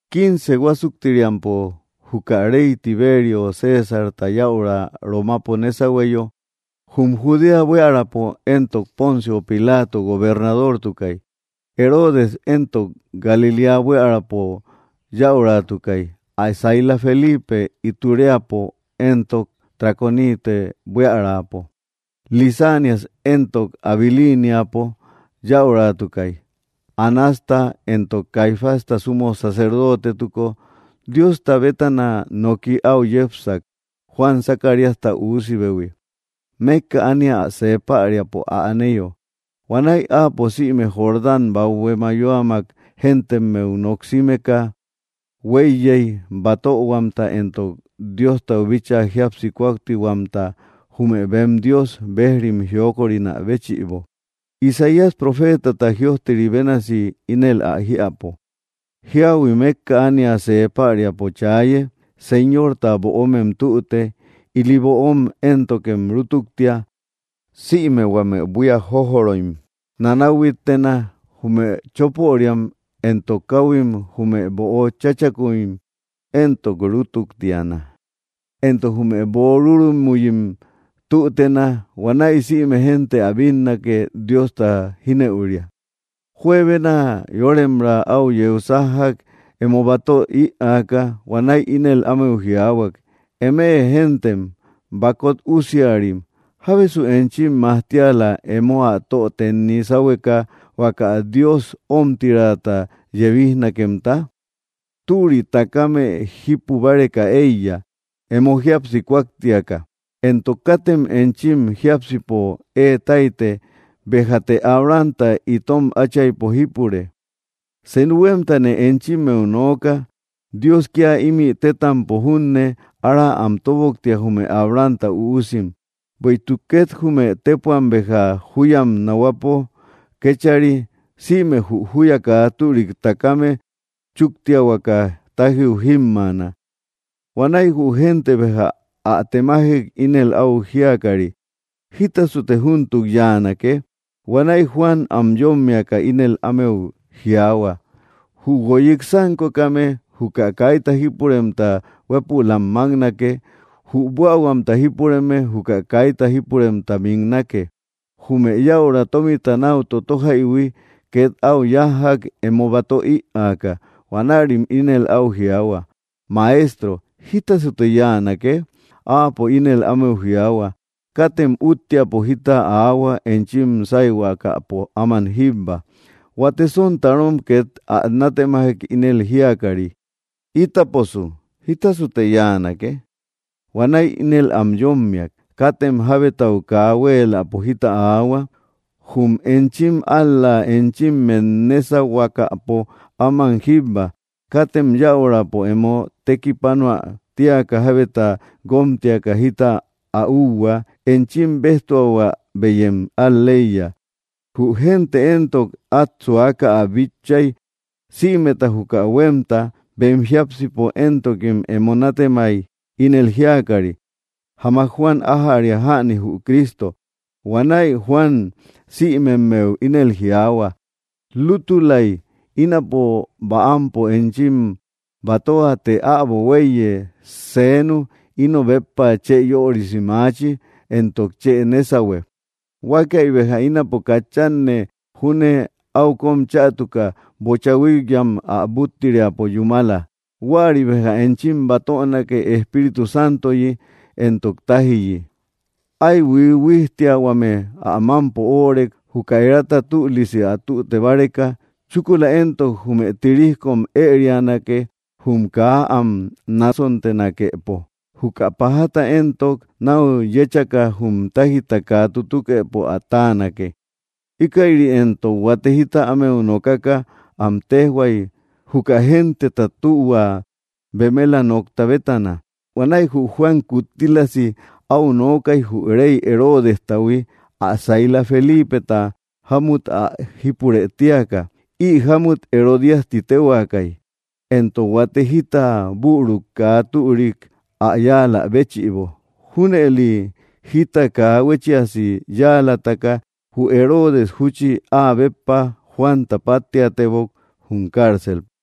Quince huásuktiriampo juka rey Tiberio Césarta yäura Romapo nésahueyo, jum Judea buiärapo éntok Poncio Pilato gobernadortukay, Heroodes éntok Galiléa buiärapo yäuratukay, ä saila Felipe Itureapo éntok Traconite buiärapo, Lisanias éntok Abiliniapo yäuratukay. Anasta éntok Caifásta sumo sacerdotetuko, Diosta bétana noki áu yepsak, Juan, Zacaríasta üusibehui, mékka ánia see päriapo ä aneyo. Huanäi áapo sïme Jordán bathue mayoamak géntemmeu noksimeka huéiyey, batöhuamta éntok Diostau bíchaa jíapsi kúaktiahuamta jume bem Dios bejrim jiokorinä béchïbo. Isaías profeetata jïojteri bénasi ínel ä jiäpo: Jiahui mékka ánia see päriapo chaaye: “Señorta böomem tüte, ili böom éntokem rútuktia. Sïme huame buía jójoroim nanahuittena, jume chopöriam, éntok káuhuim, jume böo chachakuim éntok rútuktiana; éntok jume böo rúrumuyim tütena. Huanäi sïme génte ä bínnake Diosta jínëuria.” Juebena yóremra au yeu sájjak emo batö iäka, huanäi ínel ámeu jiaahuak: —¡Eme géntem bakot usiarim! ¿Jábesu enchim majtiala emo ä tö tenni sáhueka huaka Dios omtirata yebijnakemta? Türi takame jípu báreka eiya, emo jíapsi kúaktiaka. Éntok katem enchim jiápsipo ée taite: “Béjate Abrahamta itom áchaypo jípure”; senu huémtane enchimmeu nooka, Dios kía ímï tétampo júne ára am toboktia, jume Abrahamta üusim. Bueïtuk két jume tépuam béja júyam nahuapo kéchari, sïme jü júya kaa türik takame chúktiahuaka tájiu jímmaana. Huanäi jü génte béja ä temajek, ínel áu jíakari: —¿Jítasute, júntuk yáanake? Huanäi Juan am yómmiaka ínel ámeu jiaahua: —Jü guoyik sánkokame, juka kaita jípuremta huépülam máknake; jü buähuamta jípureme, juka kaita jípuremta miknake. Jume yäura tómita náu tótojaihui két áu yájjak emo batö iäka. Huanärim ínel áu jiaahua: —Maestro, ¿jítasasute yáanake? Áapo ínel ámeu jiaahua: —Katem úttiapo jita aahua enchim sáyhuakäpo áman jíbba. Huate sontarom két ä nátemajek ínel jíakari: —Ítaposu, ¿jítasasute yáanake? Huanäi ínel am yómmiak: —Katem jabetau kaa huéeläpo jita aahua, ál‑la enchimmet nésayhuakäpo áman jíbba. Katem yäurapo emo tekipanoä tíaka, jábeta guómtiaka jítasu ä úhua. Enchim béjtuahuä beyem al‑leiya. Jü gente éntok át suaka ä bitchay sïmeta juka huémta, bem jiápsipo éntokim emo nátemay, ínel jíakari: “Jamak Juan ájäria jäni jü Cristo.” Huanäi Juan sïmemmeu ínel jiaahua: —Lútulay ínapo bäampo enchim batöa; të äbo huéiye senu ino béppa chë yörisi maachi, éntok chë nésahue. Huakäi béja ínapo katchanne júne áu kóm chätuka bocha huíkyam ä búttiriapo yúmala. Huäri béja enchim batönake Espíritu Santoyi éntok tájiyi. Ái huijhuijtiahuame ä mámpo óorek, juka erata tülisi ä tüte báreka. Chúkula éntok jume tirijkom ërianake jum kaa am nasontenakepo, juka pajata éntok náu yéchaka jum táijta kaa tutukëpo ä táanake. Íkäiri éntok huate jita ámeu nokaka, am téjhuay, juka genteta tühua bemela nokta bétana. Huanäi jü Juan kuttílasi áu nookay jü rey Heroodestahui ä saila Felipeta jámut ä jípurë tíaka (Ï jámut Herodias ti téhuaakay), éntok huate jita büruk kaa türik ä yáalä béchïbo. Júnëli jita kaa huéchiasi yáalataka jü Heroodes, júchi áa béppa, Juanta páttiatebok jum cárcelpo.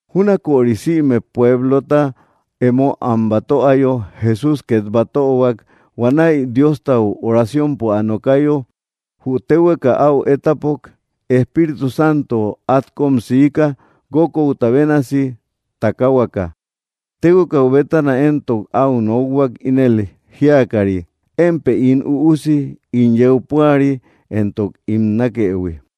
Júnaköri sïme pueblota emo am batöayo, Jesús két batöhuak. Huanäi Diostau oraciompo ä nokayo, jü téhueka áu étapok. Espíritu Santo át kóm siika, guókouta bénasi takahuaka. Téhuekau bétana éntok áu nokhuak, ínel jíakari: —Émpë ín Üusi ín yeu púari, éntok ín nákëhui.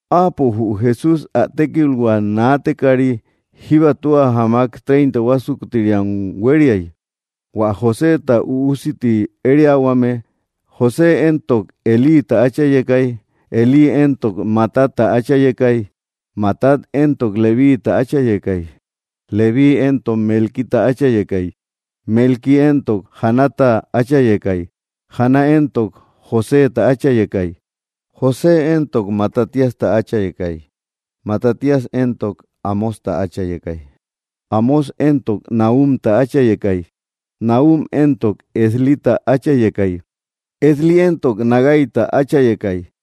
Áapo jü Jesús ä tékilhua naatekari, jíba tua jamak treinta huásuktiriam huériay. Huä Joséta üusi ti ériahuame. José éntok Elíta áchayekay. Elí éntok Matatta áchayekay. Matat éntok Levíiita áchayekay. Levíi éntok Melquita áchayekay. Melqui éntok Janata áchayekay. Jana éntok Joséta áchayekay. José éntok Matatíasta áchayekay. Matatías éntok Amósta áchayekay. Amós éntok Nahumta áchayekay. Nahum éntok Eslita áchayekay. Esli éntok Nagaita áchayekay.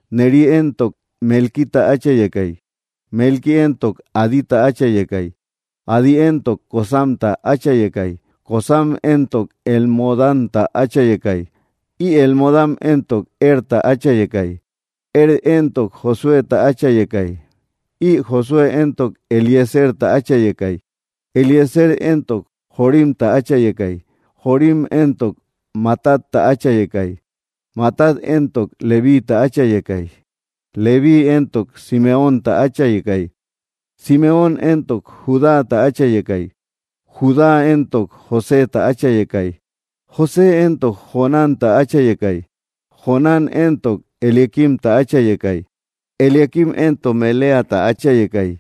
Neri éntok Melquita áchayekay. Melqui éntok Adita áchayekay. Adi éntok Cosamta áchayekay. Cosam éntok Elmodamta áchayekay. Ï Elmodam éntok Erta áchayekay. Er éntok Josuéta áchayekay. Ï Josué éntok Eliezerta áchayekay. Eliezer éntok Jorimta áchayekay. Jorim éntok Matatta áchayekay. Matat éntok Levíiita áchayekay. Levíi éntok Simeónta áchayekay. Simeón éntok Judáta áchayekay. Judá éntok Joséta áchayekay. José éntok Jonánta áchayekay. Jonán éntok Eliaquimta áchayekay. Eliaquim éntok Meleata áchayekay.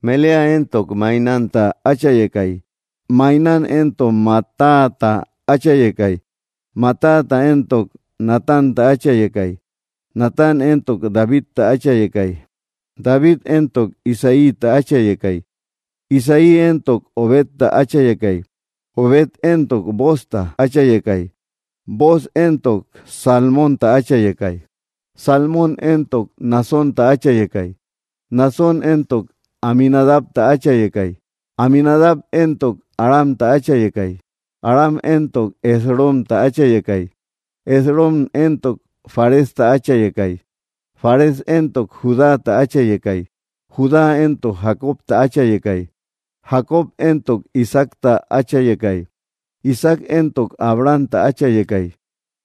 Melea éntok Mainánta áchayekay. Mainán éntok Matatata áchayekay. Matata éntok Natánta áchayekay. Natán éntok Davidta áchayekay. David éntok Isaíta áchayekay. Isaí éntok Obedta áchayekay. Obed éntok Boozta áchayekay. Booz éntok Salmónta áchayekay. Salmón éntok Naasónta áchayekay. Naasón éntok Aminadabta áchayekay. Aminadab éntok Aramta áchayekay. Aram éntok Esromta áchayekay. Esrom éntok Faresta áchayekay. Fares éntok Judáta áchayekay. Judá éntok Jacobta áchayekay. Jacob éntok Isaacta áchayekay. Isaac éntok Abrahamta áchayekay.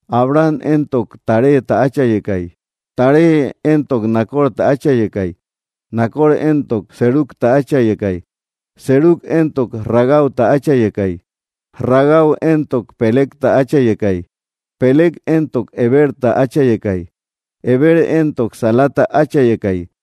Abraham éntok Taréta áchayekay. Taré éntok Nacorta áchayekay. Nacor éntok Serugta áchayekay. Serug éntok Ragauta áchayekay. Ragau éntok Pelegta áchayekay. Peleg éntok Heberta áchayekay. Heber éntok Salata áchayekay.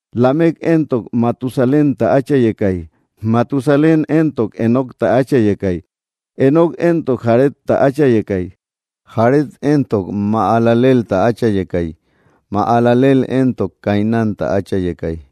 Lamec éntok Matusalénta áchayekay. Matusalén éntok Enocta áchayekay. Enoc éntok Jaredta áchayekay. Jared éntok Mahalaleelta áchayekay. Mahalaleel éntok Cainánta áchayekay.